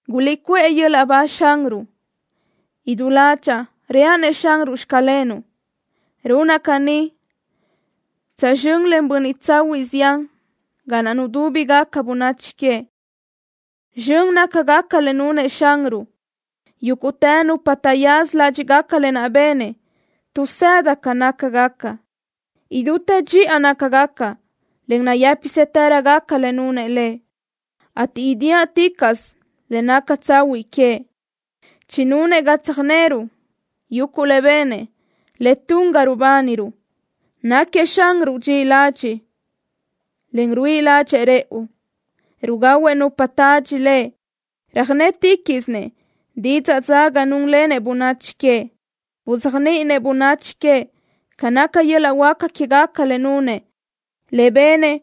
¡Guliʼcuʼë yöl-laʼ ba Xanruʼ! Idú ládxaʼa reaʼ-nëʼ Xanruʼ: “Xclenuʼ.” Runaʼ caní tsazxö́n len bönniʼ tsahuiʼ zián ga naʼ nudúbigaca bönachi queëʼ. Zxön nácagaca le nunëʼ Xanruʼ. Yúguʼtë nupa taʼyaza ládxiʼgaca lë naʼ benëʼ tuʼsëda ca nácagaca. Idútë dxiʼa nácagaca, en nayë́pisëtërögaca le nunëʼ Lëʼ, ateʼ idiáʼticaʼsö le naca tsahuiʼ queëʼ. Chinunëʼ ga tsöjneruʼ yuguʼ le benëʼ, le tun ga rubániruʼ. Náquiëʼ Xanruʼ dxiʼi ladxiʼ, en ruíʼi ládxëʼë rëʼu. Rugahuëʼ nupa tadxi Lëʼ. Röjnéticaʼsëʼ didzaʼ dzaga núnlenëʼ bönachi queëʼ. Buzéajniʼinëʼ bönachi queëʼ ca naca yöl-laʼ huáca quégaca le nunëʼ, le benëʼ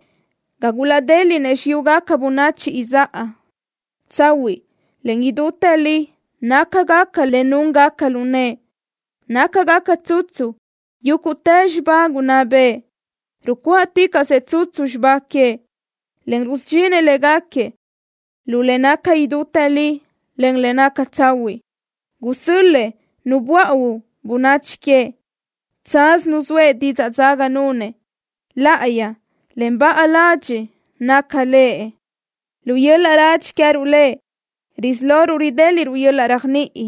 ga gulaʼdéliʼnëʼ xiyúgaca bönachi izáʼa. Tsahuiʼ, en idútë li nácagaca le núngaca lu nëʼë. Nácagaca tsutsu yúguʼtë xibá gunná bëʼë. Rucuáʼticaʼsëʼ tsutsu xibá queëʼ, en rusudxinëʼ léguequi lu le naca idútë li, en le naca tsahuiʼ. Gusö́l-lëʼë Nu buáʼuö bönachi queëʼ. Tsaz nuzóëʼ didzaʼ dzaga nunëʼ. Láʼayi, en baʼa ladxiʼ naca Lëʼ. Lu yöl-laʼ radxi queë́ruʼ Lëʼ risí loruʼ ridéliʼruʼ yöl-laʼ réajniʼi.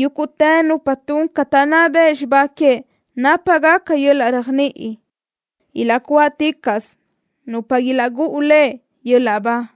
Yúguʼtë nupa tun ca taʼnná bëʼ xibá queëʼ nápagaca yöl-laʼ réajniʼi. Ilaʼcuáʼticaʼsö nupa ilaʼgúʼu Lëʼ yöl-laʼ ba.